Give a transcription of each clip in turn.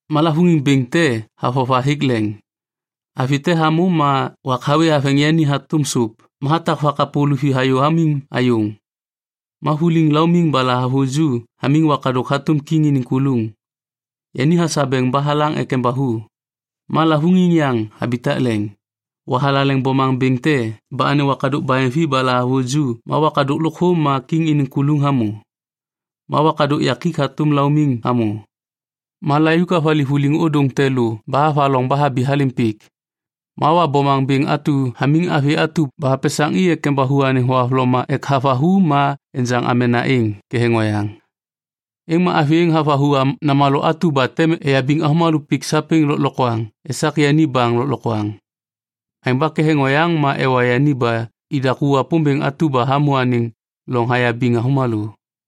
Ma lavôŋiŋ bêŋ te havova hêk leŋ: avi te hamô ma wak hawê haveŋ yani hatôm sôp ma hatak vakapô luvi hayô hamiŋ ayôŋ. Ma vuliŋ laumiŋ ba lahavuju hamiŋ wakadôk hatôm kiŋ iniŋ kuluŋ. Yani hasabeŋ ba halaŋ ek embathu. Ma lavôŋiŋ yaŋ habitak leŋ: Wa thalaleŋ bomaŋ bêŋ te ba anêŋ wakadôk baheŋvi ba lahavuju ma wakadôk lôkthô ma kiŋ iniŋ kuluŋ hamô. Ma wakadôk yakik hatôm laumiŋ hamô. Ma layuk havali vuliŋ ôdôŋ te lô ba havaloŋ ba habi halêm pik. Ma Wa bomaŋ bêŋ atu hamiŋ avi atu ba hapesaŋ i ek embathu anêŋ thohavloma ek havathu ma enjaŋ amena êŋ ketheŋ oyaŋ. Êŋ ma avi êŋ havathu namalô atu ba tem eyabiŋ avômalô pik sapêŋ lôklokwaŋ esak yani baŋ malaiŋ. Aêŋ ba ketheŋ oyaŋ ma ewa yani ba i daku Wapômbêŋ atu ba hamô anêŋ loŋ hayabiŋ avômalô.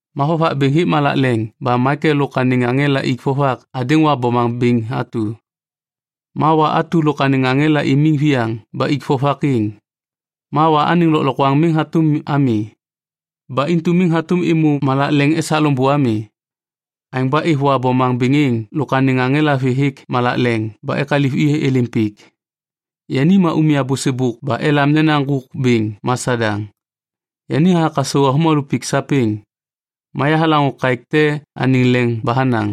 Ma vovak bêŋ hêk malak leŋ ba Maikel lôk anêŋ aŋela ik vovak hadêŋ Wa bomaŋ bêŋ atu. Ma Wa atu lôk anêŋ aŋela imiŋ viyaŋ ba ik vovak êŋ. Ma Wa anêŋ lôklokwaŋ miŋ hatôm ami. Ba intu miŋ hatôm êmô malak leŋ esak loŋbô ami. Aêŋ ba êv Wa bomaŋ bêŋ êŋ lôk anêŋ aŋela vê hêk malak leŋ ba ekaliv i êlêm pik. Yani ma umya bôsêbôk ba elam nena Ŋgôk Bêŋ ma Sadaŋ. Yani hathak hasau avômalô pik sapêŋ. Ma yahalaŋô kaêk te anêŋ leŋ ba hanaŋ,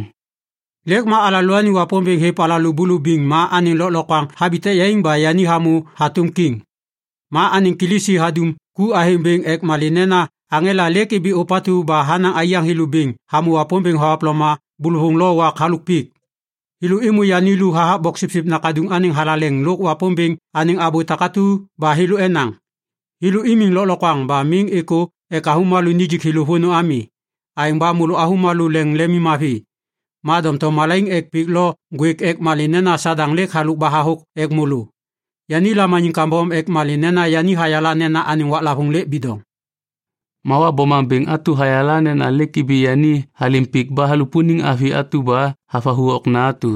“Lêk ma alalôaniŋ Wapômbêŋ hêv alalô bulubiŋ ma anêŋ lôklokwaŋ habitak yaiŋ ba yani hamô hatôm kiŋ. Ma anêŋ Kilisi hadum ku athêŋ bêŋ ek malê nena aŋela lêk ibi ôpatu ba hanaŋ aiyaŋ thêlô bêŋ hamô Wapômbêŋ thohavloma bôlôvôŋ lo wak halôk pik. Thêlô êmô yani lu hathak Boksipsip Nakaduŋ anêŋ thalaleŋ lôk Wapômbêŋ anêŋ abô takatu ba thêlô enaŋ. Thêlô imiŋ lôklokwaŋ ba miŋ êkô ek avômalô nijik thêlô vônô ami. Aêŋ ba môlô avômalô leŋ lemimmavi. Ma doŋtom malaiŋ ek pik lo ŋgwêk ek malê nena Sadaŋ lêk halôk ba hathôk ek môlô. Yani lamaniŋ kambom ek malê nena yani hayala nena anêŋ waklavôŋ lêk bidoŋ.” Wa bomaŋ bêŋ atu hayala nena lêk ibi yani halêm pik ba halupuniŋ avi atu ba havathu okna atu.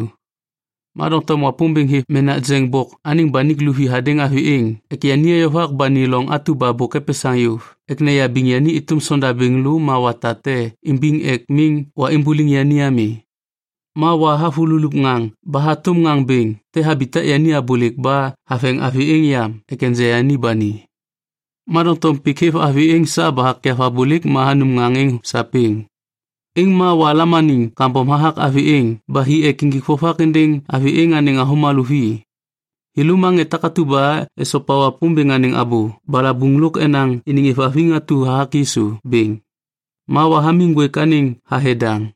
Ma doŋtom Wapômbêŋ hêv menak jeŋ bok anêŋ banik luvi hadêŋ avi êŋ ek yani eyovak ba ni loŋ atu ba bôk epesaŋ yôv ek neyabiŋ yani êtôm sondabêŋ lô ma wata te imbiŋ ek miŋ Wa imbuliŋ yani ami. Ma Wa havululup ŋaŋ ba hatôm ŋaŋ bêŋ te habitak yani abôlêk ba haveŋ avi êŋ yam ek enja yani ba ni. Ma doŋtom pik hêv avi êŋ sa ba hakyav abôlêk ba hanum ŋaŋ êŋ sapêŋ. Êŋ ma Wa lamaniŋ kambom hathak avi êŋ ba hi ek injik vovak êndêŋ avi êŋ anêŋ avômena vi. Thêlô ma ŋê takatu ba esopa Wapômbêŋ anêŋ abô balabuŋ lôk enaŋ iniŋ êvhaviŋ atu hathak Yisu bêŋ. Ma Wa hamiŋ ŋgwêk anêŋ thathe daŋ.